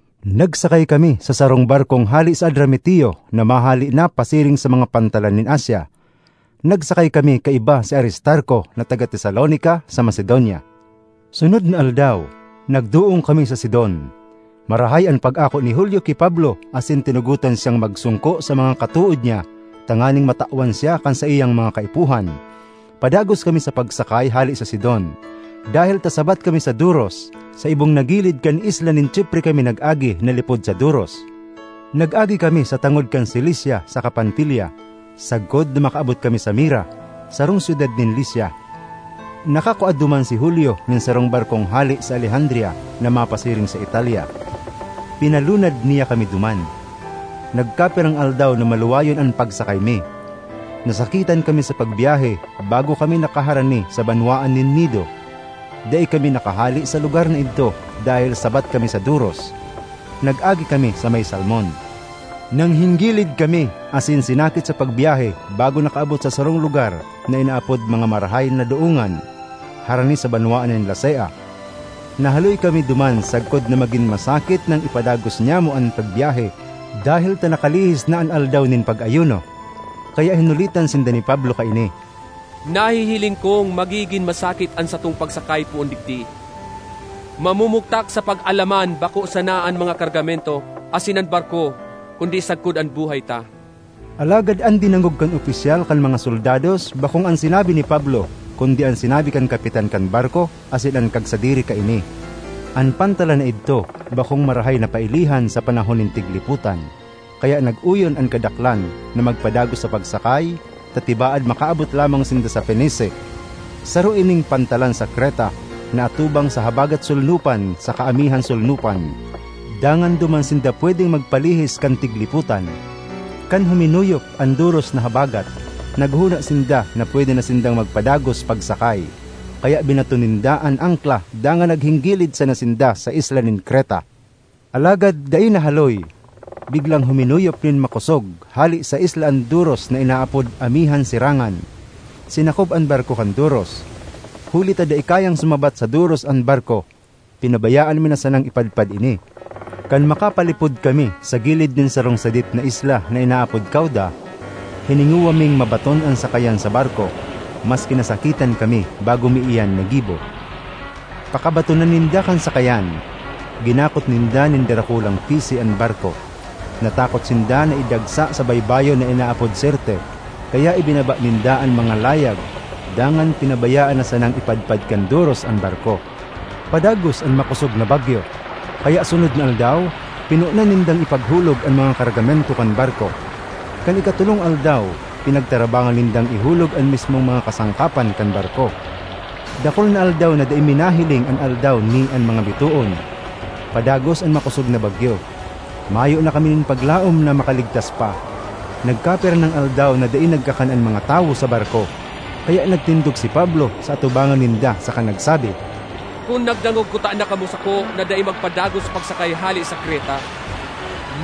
Nagsakay kami sa sarong barkong hale sa Adramitio na mahale na pasiring sa mga pantalan nin Asia. Nagsakay kami kaiba si Aristarco na taga Tesalonica, sa Macedonia. Sunod na aldaw, nagdoong kami sa Sidon. Marahay an pag-ako ni Julio ki Pablo asin tinugotan siyang magsongko sa mga katood niya, tanganing matawan siya kan saiyang mga kaipuhan. Padagos kami sa pagsakay hale sa Sidon; dahel ta sabat kami sa doros, sa ibong na gilid kan isla nin Chipre kami nag-agi na lipod sa doros. Nag-agi kami sa tangod kan Cilicia saka Panfilia, sagkod na makaabot kami sa Mira, sarong syudad nin Licia. Nakakua duman si Julio nin sarong barkong hale sa Alejandria na mapasiring sa Italia. Pinalunad niya kami duman. Nagkapirang aldaw na maluwayon an pagsakay mi. Nasakitan kami sa pagbyahe bago kami nakaharani sa banwaan nin Gnido. Dai kami nakahale sa lugar na idto dahel sabat kami sa doros. Nag-agi kami sa may Salmon. Nanghinggilid kami asin sinakit sa pagbyahe bago nakaabot sa sarong lugar na inaapod mga Marahay na Doongan, harani sa banwaan nin Lasea. Nahaloy kami duman sagkod na magin masakit nang ipadagos nyamo an pagbyahe dahel ta nakalihis na an aldaw nin pag-ayuno. Kaya hinulitan sinda ni Pablo kaini, ”Nahihiling kong magigin masakit an satong pagsakay poon digdi; mamumugtak sa pag-alaman bako sana an mga kargamento asin an barko kundi sagkod an buhay ta.” Alagad an dinangog kan opisyal kan mga soldados bakong an sinabi ni Pablo kundi an sinabi kan kapitan kan barko asin kan kagsadiri kaini. An pantalan na idto bakong marahay na pailihan sa panahon nin tiglipotan, kaya nag-oyon an kadaklan na magpadagos pagsakay ta tibaad makaabot lamang sinda sa Fenice. Saro ining pantalan sa Creta na atubang sa habagat-solnopan saka amihan-solnopan, dangan duman sinda pwedeng magpalihis kan tiglipotan. Kan huminuyop an doros na habagat, naghona sinda na pwede na sindang magpadagos pagsakay. Kaya binaton ninda an angkla dangan nanghinggilid sana sinda sa isla nin Creta. Alagad dai nahaloy, biglang huminuyop nin makosog hale sa isla an doros na inaapod “Amihan-sirangan.” Sinakob an barko kan doros; huli ta dai kayang sumabat sa doros an barko, pinabayaan mi na sanang ipadpad ini. Kan makapalipod kami sa gilid nin sarong sadit na isla na inaapod Cauda, hiningowa ming mabaton an sakayan sa barko, maski nasakitan kami bago mi iyan nagibo. Pakabatona ninda kan sakayan, ginakot ninda nin darakulang pisi an barko. Natakot sinda na idagsa sa baybayon na inaapod Sirte, kaya ibinaba ninda an mga layag dangan pinabayaan na sanang ipadpad kan doros an barko. Padagos an makosog na bagyo, kaya sunod na aldaw pinonan nindang ipaghulog an mga kargamento kan barko. Kan ikatolong aldaw pinagtarabangan nindang ihulog an mismong mga kasangkapan kan barko. Dakul na aldaw na dai mi nahiling an aldaw ni an mga bitoon; padagos an makosog na bagyo. Mayo na kami nin paglaom na makaligtas pa. Nagkapira nang aldaw na dai nagkakan an mga tawo sa barko. Kaya nagtindog si Pablo sa atubangan ninda saka nagsabi, “Kun nagdangog kutana kamo sako na dai magpadagos pagsakay hale sa Creta,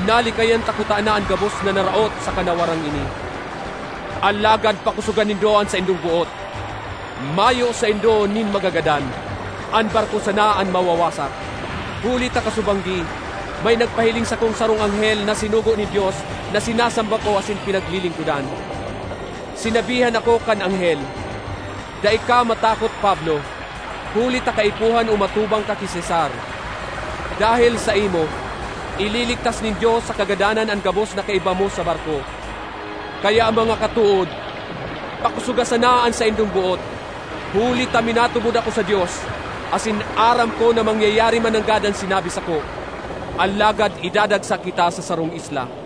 nalikayan ta kutana an gabos na naraot saka nawarang ini. Alagad pakosoga nindo an saindong boot! Mayo saindo nin magagadan; an barko sana an mawawasak. Huli ta kasubanggi may nagpahiling sakong sarong anghel na sinugo nin Dios na sinasamba ko asin pinaglilingkodan. Sinabihan ako kan anghel, ‘Dai ka matakot, Pablo, huli ta kaipuhan umatubang ka ki Cesar; dahel saimo, ililigtas nin Dios sa kagadanan an gabos na kaiba mo sa barko.’ Kaya mga katood, pakosoga sana an saindong boot, huli ta minatubod ako sa Dios, asin aram ko na mangyayari mananggad an sinabi sako. Alagad idadagsa kita sa sarong isla.”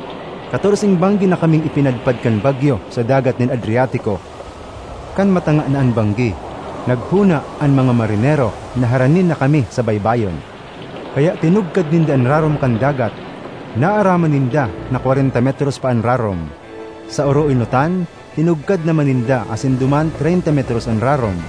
Katorseng banggi na kaming ipinadpad kan bagyo sa dagat nin Adriatico. Kan matanga na an banggi, naghona an mga marinero na harani na kami sa baybayon. Kaya tinugkad ninda an rarom kan dagat; naaraman ninda na kwarenta metros pa an rarom. Sa oroenotan, tinugkad naman ninda asin duman treynta metros an rarom.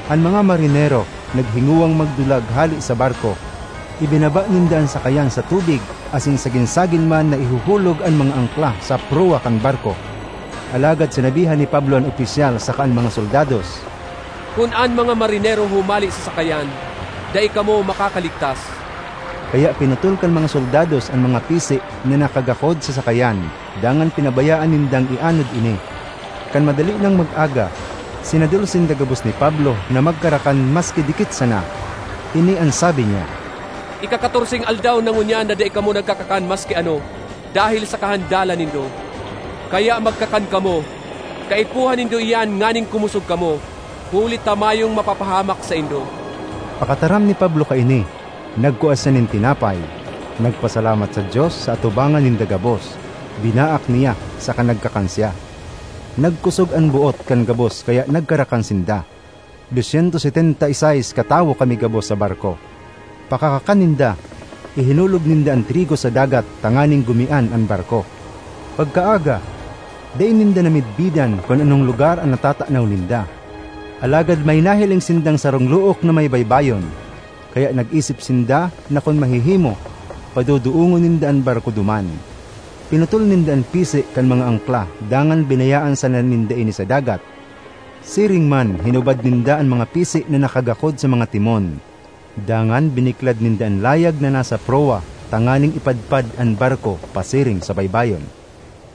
An mga marinero naghingowang magdulag hale sa barko; ibinaba ninda an sakayan sa tubig asin sagin-sagin man na ihuhulog an mga angkla sa prowa kan barko. Alagad sinabihan ni Pablo an opisyal saka an mga soldados, “Kun an mga marinero humale sa sakayan, dai kamo makakaligtas.” Kaya pinutol kan mga soldados an mga pisi na nakagakod sa sakayan dangan pinabayaan nindang ianod ini. Kan madali nang mag-aga, sinadol sinda gabos ni Pablo na magkarakan maski dikit sana. Ini an sabi niya, “Ikakatorseng aldaw na ngunyan na dai kamo nagkakakan maski ano dahel sa kahandalan nindo. Kaya magkakan kamo; kaipuhan nindo iyan nganing kumosog kamo, huli ta mayong mapapahamak saindo.” Pakataram ni Pablo kaini, nagkua siya nin tinapay, nagpasalamat sa Dios sa atubangan ninda gabos, binaak niya, saka nagkakan siya. Nagkosog an boot kan gabos kaya nagkarakan sinda. Dos syentos setenta y seis katawo kami gabos sa barko. Pakakakan ninda, ihinulog ninda an trigo sa dagat tanganing gumian an barko. Pagkaaga, dai ninda namidbidan kun anong lugar an natatanaw ninda; alagad may nahiling sindang sarong look na may baybayon, kaya nag-isip sinda na kun mahihimo, padodoongon ninda an barko duman. Pinutol ninda an pisi kan mga angkla dangan binayaan sana ninda ini sa dagat. Siring man hinubad ninda an mga pisi na nakagakod sa mga timon. Dangan biniklad ninda an layag na nasa prowa tanganing ipadpad an barko pasiring sa baybayon.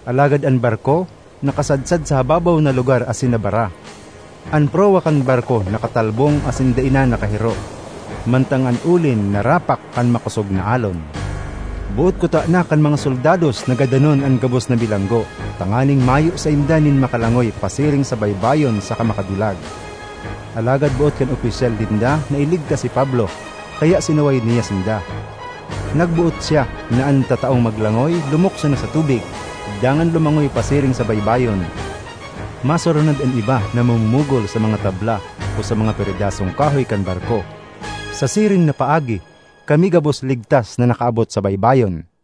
Alagad an barko nakasadsad sa hababaw na lugar asin nabara; an prowa kan barko nakatalbong asin dai na nakahiro, mantang an olin narapak kan makosog na alon. Boot kutana kan mga soldados na gadanon an gabos na bilanggo, tanganing mayo sainda nin makalangoy pasiring sa baybayon saka makadulag. Alagad boot kan opisyal ninda na iligtas si Pablo, kaya sinaway niya sinda. Nagboot siya na an mga tataong maglangoy, lumukso na sa tubig, dangan lumangoy pasiring sa baybayon; masurunod an iba na mamumugol sa mga tabla o sa mga peredasong kahoy kan barko. Sa siring na paagi, kami gabos ligtas na nakaabot sa baybayon.